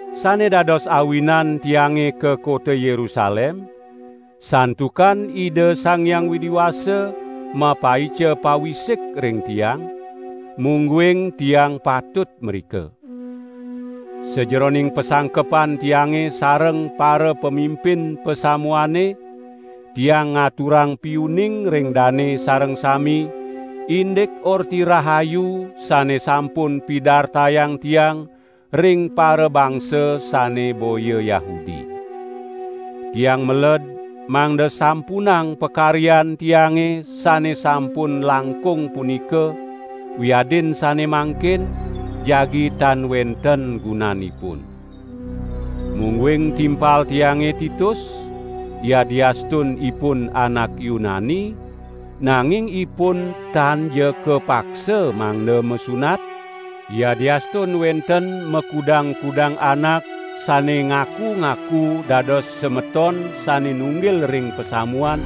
Sane dados awinan tiange ka kota Yerusalem, santukan Ida Sang Hyang Widi Wasa mapaica pawisik ring tiang, mungguing tiang patut mrika. Sajeroning pasangkepan tiange sareng parapamimpin pasamuane, tiang ngaturang piuning ring dane sareng sami, indik Orti Rahayu sane sampun pidartayang tiang ring parabangsa sane boya Yahudi. Tiang meled mangda sampunang pakaryan tiange sane sampun langkung punika, wiadin sane mangkin, jagi tan wenten gunanipun. Mungguing timpal tiange Titus, yadiastun ipun anak Yunani, nanging ipun tanja kapaksa mangda masunat, yadiastun wenten makudang-kudang anak sane ngaku-ngaku dados semeton sane nunggil ring pasamuan,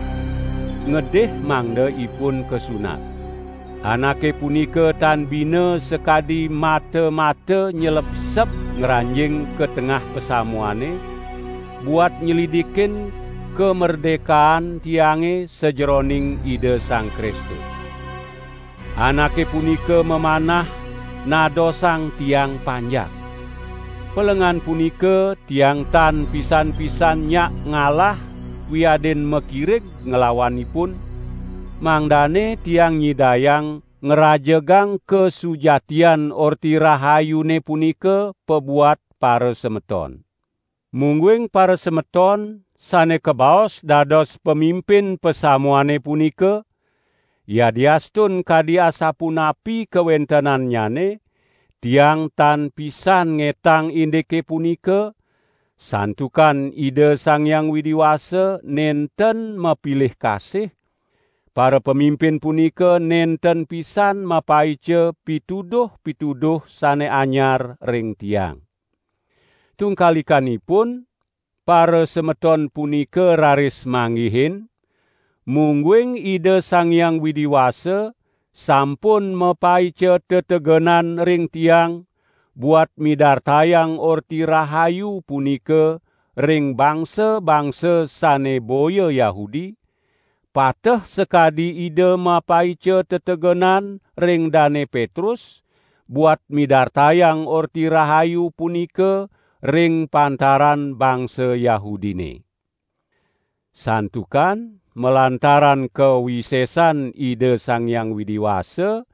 ngedih mangda ipun kasunat. Anake punika tan bina sakadi mata-mata nylebseb ngranjing ka tengah pasamuane, buat nylidikin kamerdekaan tiange sajeroning Ida Sang Kristus. Anake punika mamanah nadosang tiang panjak. Pelengan punika tiang tan pisan-pisan nyak ngalah wiadin makirig nglawan ipun, mangdane tiang nyidayang ngrajegang kasujatian Orti Rahayune punika pabuat parasemeton. Mungguing parasemeton sane kabaos dados pamimpin pasamuane punika, yadiastun kadi asapunapi kawentenannyane, tiang tan pisan ngetang indike punika, santukan Ida Sang Hyang Widi Wasa nenten mapilih kasih, parapamimpin punika nenten pisan mapaica pituduh-pituduh sane anyar ring tiang. Tungkalikanipun, parasemeton punika raris manggihin, mungguing Ida Sang Hyang Widi Wasa sampun mapaica tetegenan ring tiang buat midartayang Orti Rahayu punika ring bangsa-bangsa sane boya Yahudi, pateh sakadi Ida mapaica tetegenan ring Dane Petrus buat midartayang Orti Rahayu punika ring pantaran bangsa Yahudine. Santukan malantaran kawisesan Ida Sang Hyang Widi Wasa,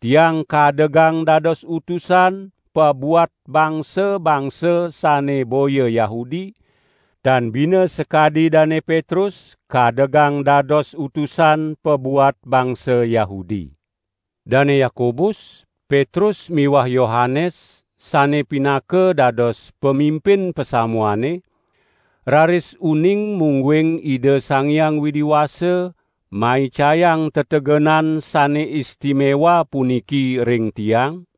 tiang kadegang dados utusan pabuat bangsa-bangsa sane boya Yahudi, tan bina sakadi Dane Petrus kadegang dadosa utusan pabuat bangsa Yahudi. Dane Yakobus, Petrus miwah Yohanes sane pinaka dados pamimpin pasamuane, raris uning mungguing Ida Sang Hyang Widi Wasa maicayang tetegenan sane istimewa puniki ring tiang,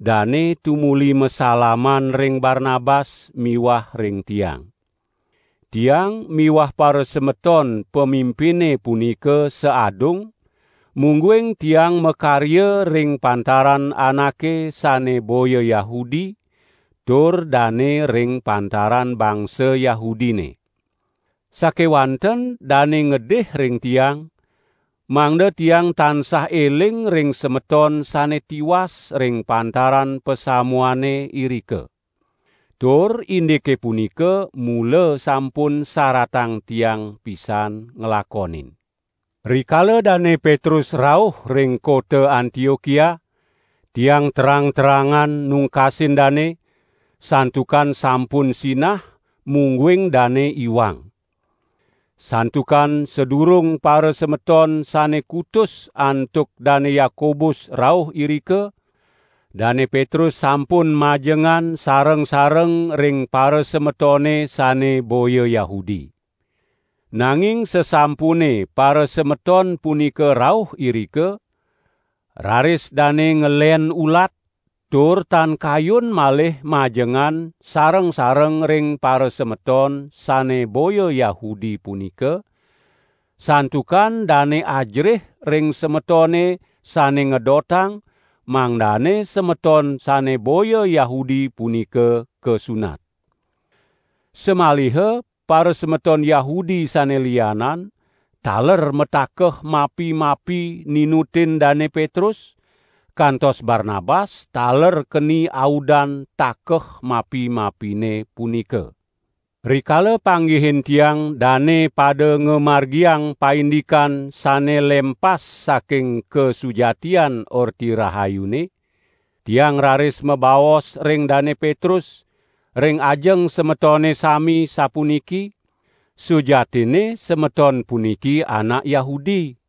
dane tumuli masalaman ring Barnabas miwah ring tiang. Tiang miwah parasemeton pamimpine punika saadung, mungguing tiang makarya ring pantaran anake sane boya Yahudi, tur dane ring pantaran bangsa Yahudine. Sakewanten dane ngedih ring tiang, mangda tiang tansah eling ring semeton sane tiwas ring pantaran pasamuane irika. Tur indike punika mula sampun saratang tiang pisan nglakonin. Rikala Dane Petrus rauh ring kota Antiokia, tiang terang-terangan nungkasin dane, santukan sampun sinah mungguing dane iwang. Santukan sadurung parasemeton sane kutus antuk Dane Yakobus rauh irika, Dane Petrus sampun majengan sareng-sareng ring parasemetone sane boya Yahudi. Nanging sasampune parasemeton punika rauh irika, raris dane ngelen ulat tur tan kayun malih majengan sareng-sareng ring parasemeton sane boya Yahudi punika, santukan dane ajerih ring semetone sane ngedotang mangdane semeton sane boya Yahudi punika kasunat. Samaliha parasemeton Yahudi sane lianan, taler matakeh mapi-mapi ninutin Dane Petrus, kantos Barnabas taler keni audan takeh mapi-mapine punika. Rikala panggihin tiang dane pada ngamargiang paindikan sane lempas saking kasujatian Orti Rahayune, tiang raris mabaos ring Dane Petrus, ring ajeng semetone sami sapuniki: "Sujatinne semeton puniki anak Yahudi,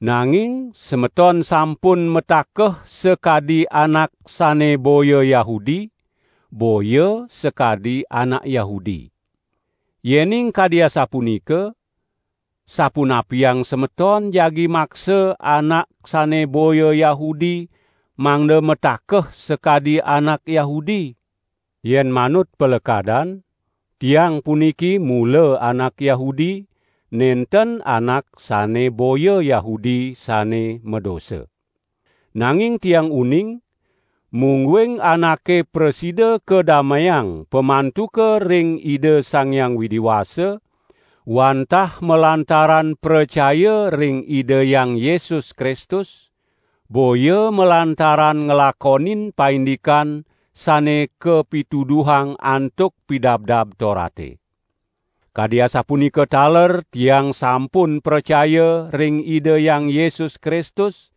nanging semeton sampun matakeh sakadi anak sane boya Yahudi, boya sakadi anak Yahudi. Yening kadi asapunika, sapunapiang semeton jagi maksa anak sane boya Yahudi mangda matakeh sakadi anak Yahudi?" Yen manut palekadan, tiang puniki mula anak Yahudi, nenten anak sane boya Yahudi sane madosa. Nanging tiang uning, mungguing anake prasida kadameang pamantuka ring Ida Sang Hyang Widi Wasa, wantah malantaran pracaya ring Ida Hyang Yesus Kristus, boya malantaran nglakonin paindikan sane kapituduhang antuk Pidabdab Torate. Kadi asapunika taler tiang sampun pracaya ring Ida Hyang Yesus Kristus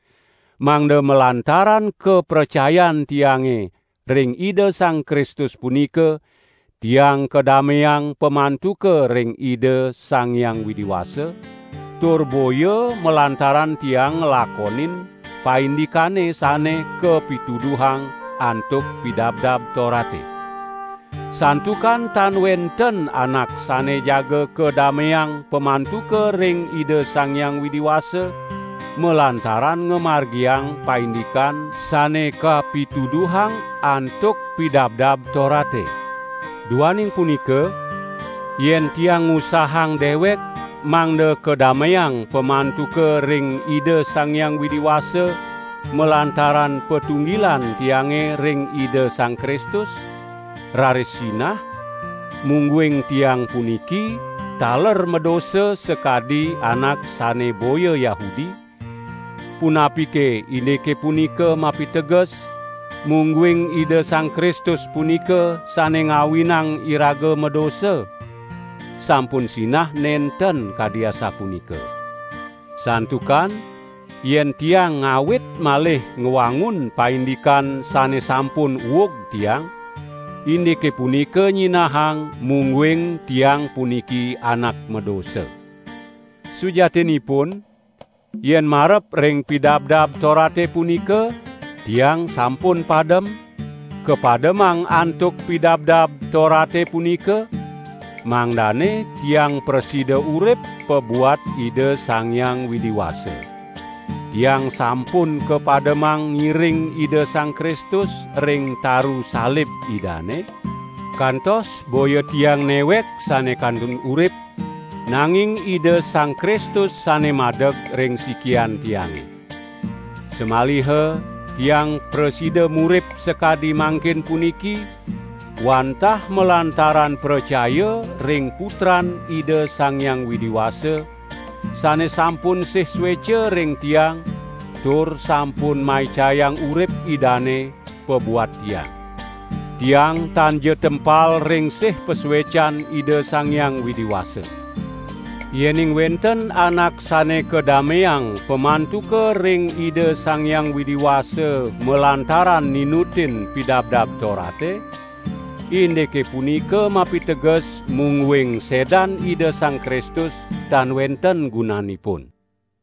mangda malantaran kapracayan tiange ring Ida Sang Kristus punika, tiang kadameang pamantuka ring Ida Sang Hyang Widi Wasa, tur boya malantaran tiang nglakonin paindikane sane kapituduhang antuk Pidabdab Torate. Santukan tan wenten anak sane jaga kadameang pamantuka ring Ida Sang Hyang Widi Wasa malantaran ngamargiang paindikan sane kapituduhang antuk Pidabdab Torate. Duaning punika yen tiang ngusahang dewek mangda kadameang pamantuka ring Ida Sang Hyang Widi Wasa malantaran patunggilan tiange ring Ida Sang Kristus, raris sinah, mungguing tiang puniki taler madosa sakadi anak sane boya Yahudi, punapike indike punika mapiteges, mungguing Ida Sang Kristus punika sane ngawinang iraga madosa? Sampun sinah nenten kadi asapunika. Santukan yen tiang ngawit malih ngwangun paindikan sane sampun uug tiang, indike punika nyinahang mungguing tiang puniki anak madosa. Sujatinipun, yen marep ring Pidabdab Torate punika, tiang sampun padem, kapademang antuk Pidabdab Torate punika, mangdane tiang prasida urip pabuat Ida Sang Hyang Widi Wasa. Tiang sampun kapademang ngiring Ida Sang Kristus ring taru salib Idane, kantos boya tiang newek sane kantun urip, nanging Ida Sang Kristus sane madeg ring sikian tiange. Samaliha tiang prasida murip sakadi mangkin puniki, wantah malantaran pracaya ring Putran Ida Sang Hyang Widi Wasa, sane sampun sih sueca ring tiang tur sampun maicayang urip Idane pabuat tiang. Tiang tanja tempal ring sih pasuecan Ida Sang Hyang Widi Wasa. Yening wenten anak sane kadameang pamantuka ring Ida Sang Hyang Widi Wasa malantaran ninutin Pidabdab Torate, indike punika mapiteges mungguing sedan Ida Sang Kristus tan wenten gunanipun.